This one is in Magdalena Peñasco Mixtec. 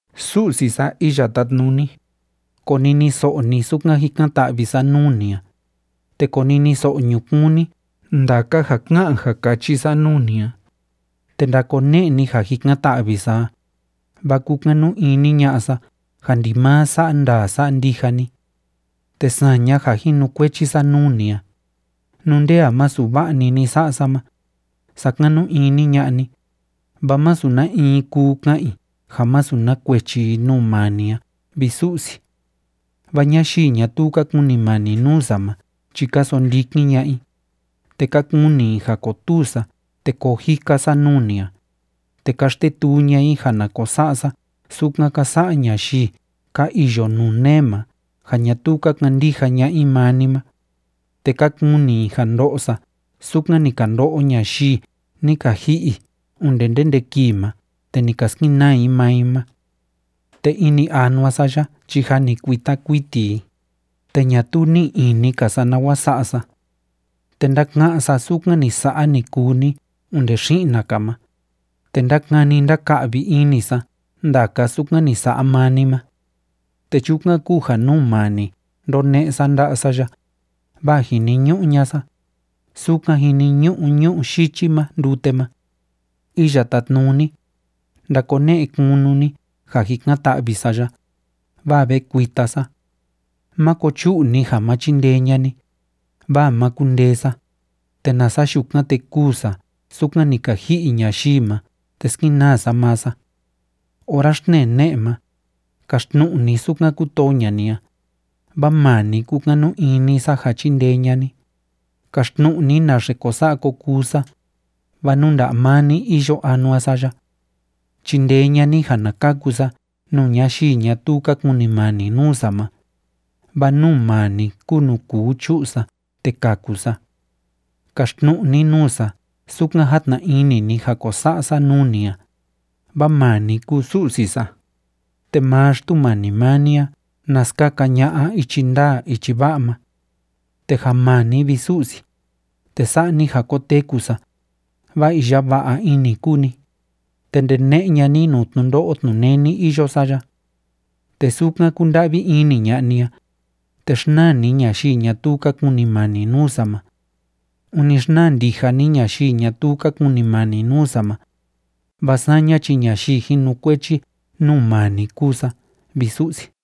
Su'si sa Iya Tátnuni, koniniso'o ni sukan jikan‑ta'vi sa nuu ni a, te koniniso'o ñukuun ni ndaka ja ká'an ja káchi sa nuu ni a, te ndakone'e ni ja jikan‑ta'vi sa a, vaa kúkanu ini ña'a sa ja ndimaa sa'a ndaa sa'a ndija ni. Te saña ja jinukuechi sa nuu ni a, nú nde a masu va'a‑ni ni sa'a sa ma, sakanu ini ña'a ni, vaa masu na in kuu ka'an i ja masu na kuechi i nuu maa ni a, vi Su'si. Vaa ñayii ñatuu ka kunimani nuu sa ma chi ka sondikin ña'a i, te ka kuni i ja kotuu sa te koo jika sa nuu ni a, te ka xtetuu ña'a i ja na ko sa'a sa sukan ka sa'a ñayii ka iyo nuu nee ma ja ñatuu ka kandija ña'a i maa ni ma, te ka kuni i ja ndo'o sa sukan ni ka ndo'o ñayii ni ka ji'i onde ndende kii ma te ni ka skenaa i maa i ma. Te ini anua sa ya chi jâ ni kuita kuiti i, te ñatuu ní'i ini‑ka sa nawa sa'a sa. Te ndáka'án sa sukan ni sa'a, ni kuu ni onde xi'na‑ka ma, te ndákani ndáka'vi ini sa ndaka sukan ni sa'a maa ni ma. Te chukan kúu ja nuu maa ni ndóne'e sa nda'a sa ya, vaa jiniñu'u ña'a sa, sukan jiniñu'u ñu'ú yichi ma ndute ma. Iya Tátnuni, ndakone'e kunu ni ja jikan‑ta'vi sa ya, vaa ve kuita sa. Máko chu'u ni ja ma chindee ña'a ni, vaa ma kundee sa, te nasa yukan, te kûu sa sukan ni ka ji'i ñayii ma te skenaa sa maa sa. Ora xtnee ne'e ma, kaxtnu'u ni sukan kútoo ña'a ni a, vaa maa ni kúkanu ini sa ja chindee ña'a ni. Kaxtnu'u ni naxe ko sa'a ko kuu sa, vaa nuu nda'a maa ni iyo anua sa ya. Chindee ña'a ni ja na kaku sa nuu ñayii ñatuu ka kunimani nuu sa ma, vaa nuu maa ni kúu nuu kuu chu'u sa te kaku sa. Kaxtnu'u ni nuu sa sukan játna ini ni ja ko sa'a sa nuu ni a, vaa maa ni kúu Su'si sa, te maa Xtumani maa ni a na skaka ña'a ichi ndaa ichi va'a ma. Te ja maa ni, vi Su'si, te sa'a ni ja koteku sa, vaa iya va'a ini kúu ni, te ndene'e ña'a ni nuu tnundo'o tnuneni iyo sa ya. Te sukan kúnda'vi ini ña'a ni a, te xnaa ni ñayii ñatuu ka kunimani nuu sa ma. Ûni xnaa ndija ni ñayii ñatuu ka kunimani nuu sa ma, vaa saña chi ñayii jinukuechi nuu maa ni kúu sa, vi Su'si.